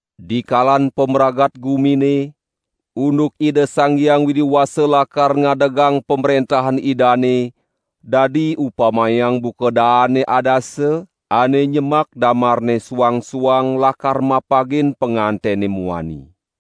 "Dikalan pamragat gumine, unduk Ida Sang Hyang Widi Wasa lakar ngadegang Pamrentahan Idane dadi upamayang buka daane adasa, ane nyemak damarne suang-suang lakar mapagin pangantene muani.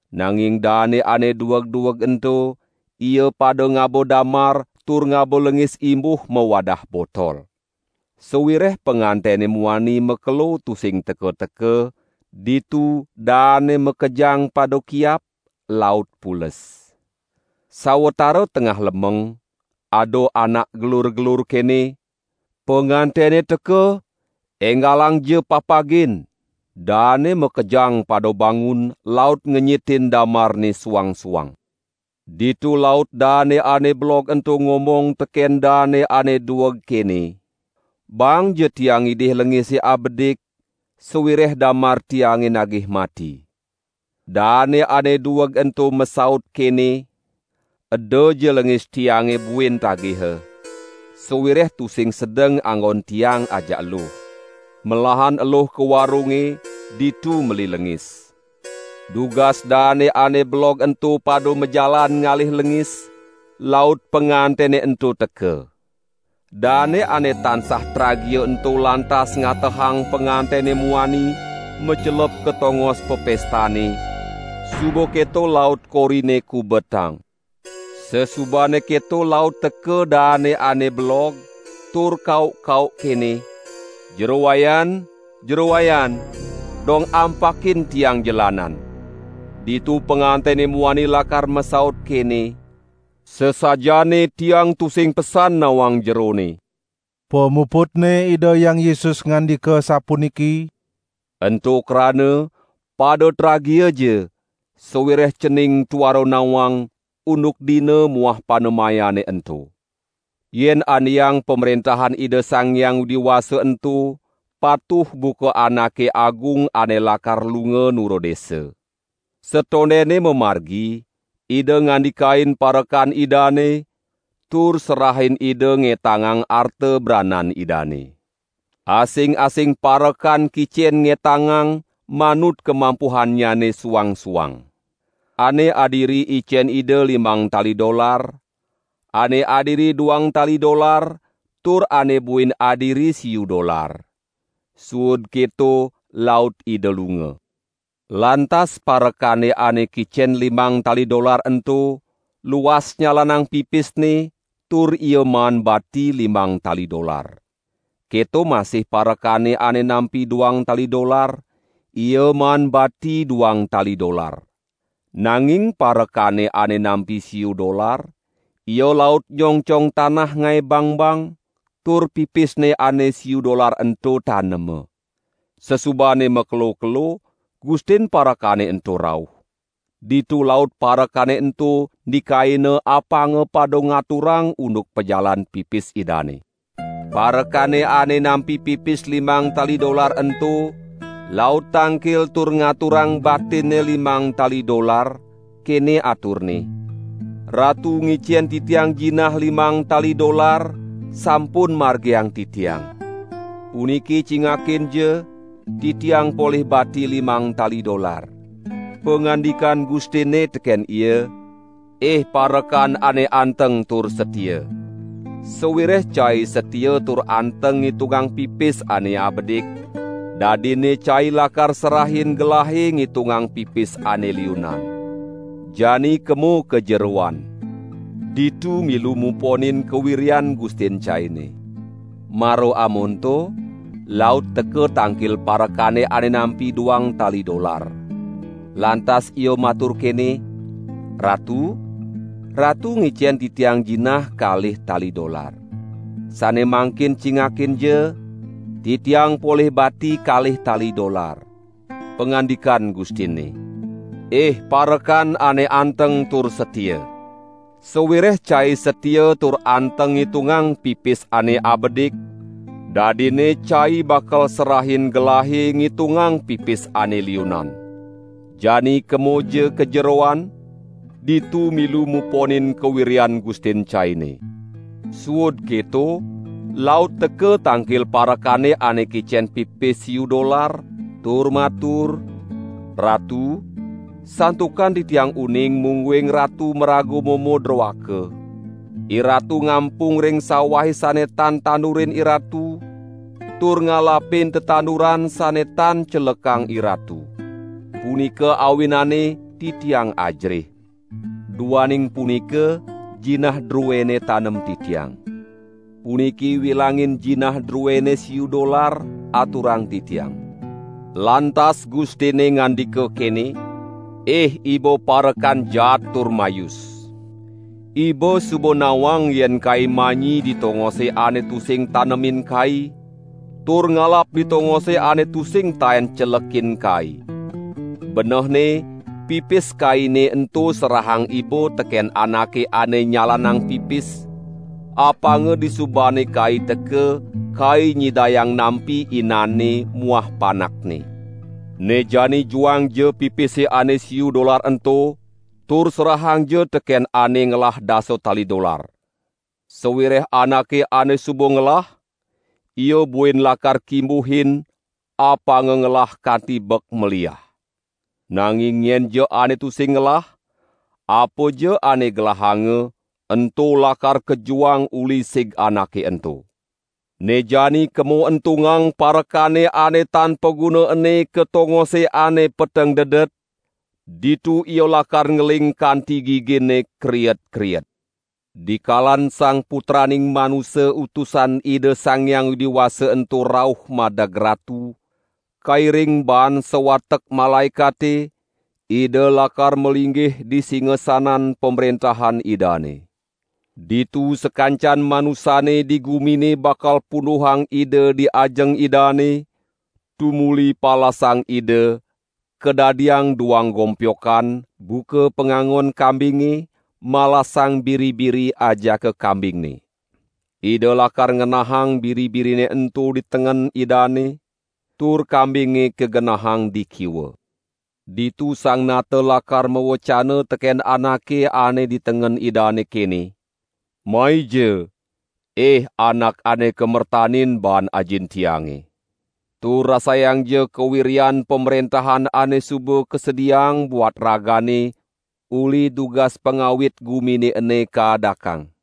Nanging daane ane dueg-dueg ento, ia pada ngaba damar tur ngaba lengis imbuh mawadah botol. Sawireh pangantene muani makelo tusing teka-teka, ditu daane makejang pada kiap, laut pules. Sawatara tengah lemeng, ada anak gelur-gelur kene: 'Pangantene teka, enggalangja papagin!' Daane makejang pada bangun laut ngenyitin damarne suang-suang. Ditu laut daane ane belog ento ngomong teken daane ane dueg kene: 'Baangja tiang ngidih lengise abedik sawireh damar tiange nagih mati.' Daane ane dueg ento masaut kene: 'Edaja lengis tiange buin tagiha, sawireh tusing sedeng anggon tiang ajak eluh. Melahan eluh ka warunge, ditu meli lengis!' Dugas daane ane belog ento pada majalan ngalih lengis, laut pangantene ento teka. Daane ane tansah tragia ento lantas ngatehang pangantene muani macelep ka tongos papestane, suba keto laut korine kubetang. Sasubane keto laut teka daane ane belog, tur kauk-kauk kene: 'Jero Wayan, Jero Wayan, dong ampakin tiang jelanan!' Ditu pangantene muani lakar masaut kene: 'Sasajaane tiang tusing pesan nawang jerone.' " Pamuputne Ida Hyang Yesus ngandika sapuniki: "Ento krana pada tragiaja sawireh cening tuara nawang, unduk dina muah panemayane ento." "Yen andeang Pamrentahan Ida Sang Hyang Widi Wasa ento patuh buka anake agung ane lakar lunga nura desa. Satondene mamargi, ida ngandikain parekan idane, tur serahin ida ngetangang arta branan idane. Asing-asing parekan kicen ngetangang manut kamampuhannyane suang-suang. Ane adiri icen ida limang tali dolar, ane adiri duang tali dolar, tur ane buin adiri siu dolar. Suud keto laut ida lunga. Lantas parekane ane kicen limang tali dolar ento, luas nyalanang pipisne, tur ia maan bati limang tali dolar. Keto masih parekane ane nampi duang tali dolar, ia maan bati duang tali dolar. Nanging parekane ane nampi siu dolar, ia laut nyongcong tanah ngae bangbang, tur pipisne ane siu dolar ento tanema. Sasubane makelo-kelo, gustin parekane ento rauh. Ditu laut parekane ento ndikaina apanga pada ngaturang unduk pajalan pipis idane. Parekane ane nampi pipis limang tali dolar ento laut tangkil tur ngaturang batinne limang tali dolar, kene aturne: 'Ratu ngicen titiang jinah limang tali dolar, sampun margiang titiang. Puniki cingakinja titiang polih bati limang tali dolar.' Pangandikan gustinne teken ia: 'Ih parekan ane anteng tur satia. Sawireh cai satia tur anteng ngitungang pipis ane abedik, dadinne cai lakar serahin gelahe ngitungang pipis ane liunan. Jani kemo ka jeroan, ditu milu muponin kawiryan gustin caine!' Mara amonto, laut teka tangkil parekane ane nampi duang tali dolar. Lantas ia matur kene: 'Ratu, ratu ngicen titiang jinah kalih tali dolar. Sane mangkin cingakinja, titiang polih bati kalih tali dolar!' Pangandikan gustinne: 'Ih parekan ane anteng tur satia; sawireh cai satia tur anteng ngitungang pipis ane abedik, dadinne cai bakal serahin gelahe ngitungang pipis ane liunan. Jani kemoja ka jeroan, ditu milu muponin kawiryan gustin caine!' Suud keto laut teka tangkil parekane ane kicen pipis siu dolar, tur matur: 'Ratu, santukan titiang uning mungguing ratu maraga momo droaka. Iratu ngampung ring sawahe sane tan tandurin iratu, tur ngalapin tetanduran sane tan celekang iratu. Punika awinanne titiang ajerih. Duaning punika jinah druene tanem titiang. Puniki wilangin jinah druene siu dolar, aturang titiang!' Lantas gustinne ngandika kene: 'Ih iba parekan jaat tur mayus. Iba suba nawang yen kai manyi di tongose ane tusing tanemin kai, tur ngalap di tongose ane tusing taen celekin kai. Benehne pipis kaine ento serahang iba teken anake ane nyalanang pipis, apanga disubane kai teka, kai nyidayang nampi inanne muah panakne. Ne jani juangja pipise ane siu dolar ento tur serahangja teken ane ngelah dasa tali dolar. Sawireh anake ane suba ngelah, ia buin lakar kimbuhin, apanga ngelah kanti bek maliah. Nanging nyenja ane tusing ngelah, apaja ane gelahanga, ento lakar kajuang uli sig anake ento. Ne jani kemo entungang parekane ane tan paguna ene ka tongose ane peteng dedet, ditu ia lakar ngeling kanti giginne kriet-kriet.' " "Dikalan Sang Putraning Manusa Utusan Ida Sang Hyang Widi Wasa ento rauh madeg Ratu, kairing baan sawatek malaekate, Ida lakar malinggih di singasanan Pamrentahan Idane. Ditu sakancan manusane di gumine bakal punduhang Ida di ajeng Idane, tumuli palasang Ida, kadadiang duang gompyokan, buka pangangon kambinge malasang biri-biri ajaka kambingne. Ida lakar ngenahang biri-birine ento di tengen Idane, tur kambinge kagenahang di kiwa. Ditu Sang Nata lakar mawecana teken anake ane di tengen Idane kene: 'Maija! Ih anak ane kamertanin baan Ajin Tiange. Tur rasayangja kawiryan pamrentahan ane suba kasediaang buat ragane uli dugas pangawit gumine ene kaadakang.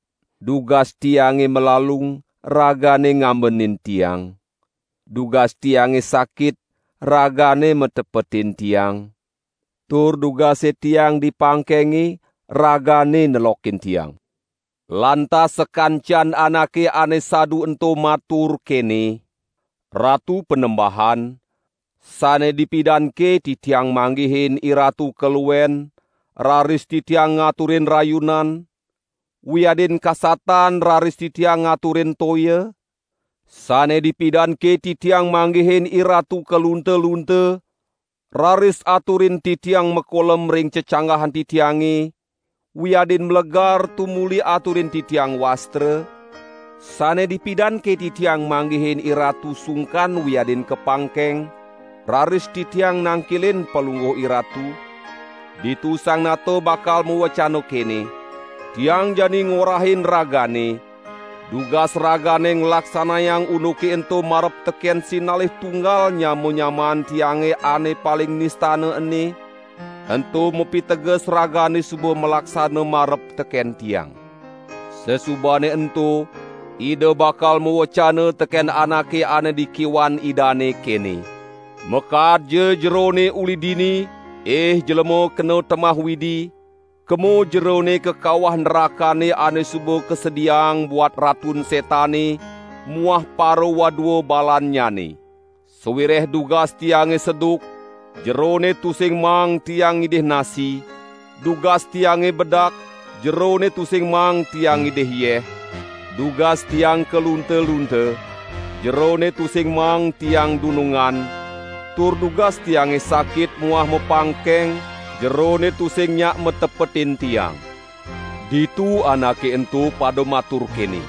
dugas Tiange malalung ragane ngambenin Tiang; dugas Tiange sakit, ragane matepetin Tiang; tur dugase Tiang di pangkenge, ragane nelokin Tiang.' Lantas sakancan anake ane sadu ento matur, kene: 'Ratu Panembahan, sane dipidanke titiang manggihin IRatu kaluen, raris titiang ngaturin rayunan, wiadin kasatan raris titiang ngaturin toya? Sane dipidanke titiang manggihin IRatu kalunta-lunta, raris aturin titiang makolem ring cecanggahan titiange, wiadin malegar tumuli aturin titiang wastra? Sane dipidanke titiang manggihin IRatu sungkan wiadin kapangkeng, raris titiang nangkilin Palungguh IRatu?' Ditu Sang Nata bakal mawecana kene: 'Tiang jani ngorahin ragane, dugas ragane nglaksanayang unduke ento marep teken sinalih tunggal nyama-nyamaan Tiange ane paling nistana ene, ento mapiteges ragane suba malaksana marep teken Tiang.' Sasubane ento, Ida bakal mawecana teken anake ane di kiwan Idane, kene: 'Makaadja jerone uli dini; ih jlema kena temah Widi, kemo jerone ka kawah nrakane ane suba kasediaang buat Ratun Setane muah parawadua balannyane. Sawireh dugas Tiange seduk, jerone tusing maang Tiang ngidih nasi; dugas Tiange bedak jerone tusing maang Tiang ngidih yeh; dugas Tiang kalunta-lunta, jerone tusing maang Tiang dunungan; tur dugas Tiange sakit muah mapangkeng jerone tusing nyak matepetin Tiang.' Ditu anake ento pada matur kene: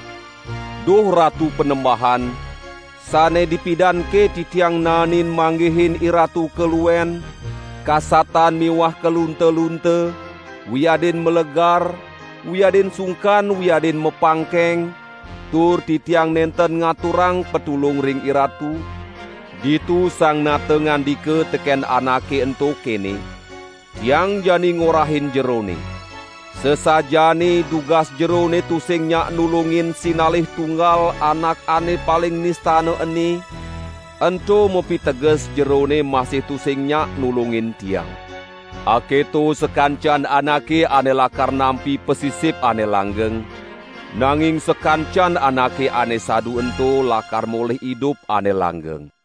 'Duh Ratu Panembahan, sane dipidanke titiang naenin manggihin IRatu kaluen, kasatan miwah kalunta-lunta, wiadin malegar, wiadin sungkan wiadin mapangkeng, tur titiang nenten ngaturang patulung ring IRatu?' Ditu Sang Nata ngandika teken anake ento kene: 'Tiang jani ngorahin jerone: Sasajaane dugas jerone tusing nyak nulungin sinalih tunggal anak ane paling nistana ene, ento mapiteges jerone masih tusing nyak nulungin Tiang.' Aketo sakancan anake ane lakar nampi pasisip ane langgeng, nanging sakancan anake ane sadu ento lakar molih idup ane langgeng."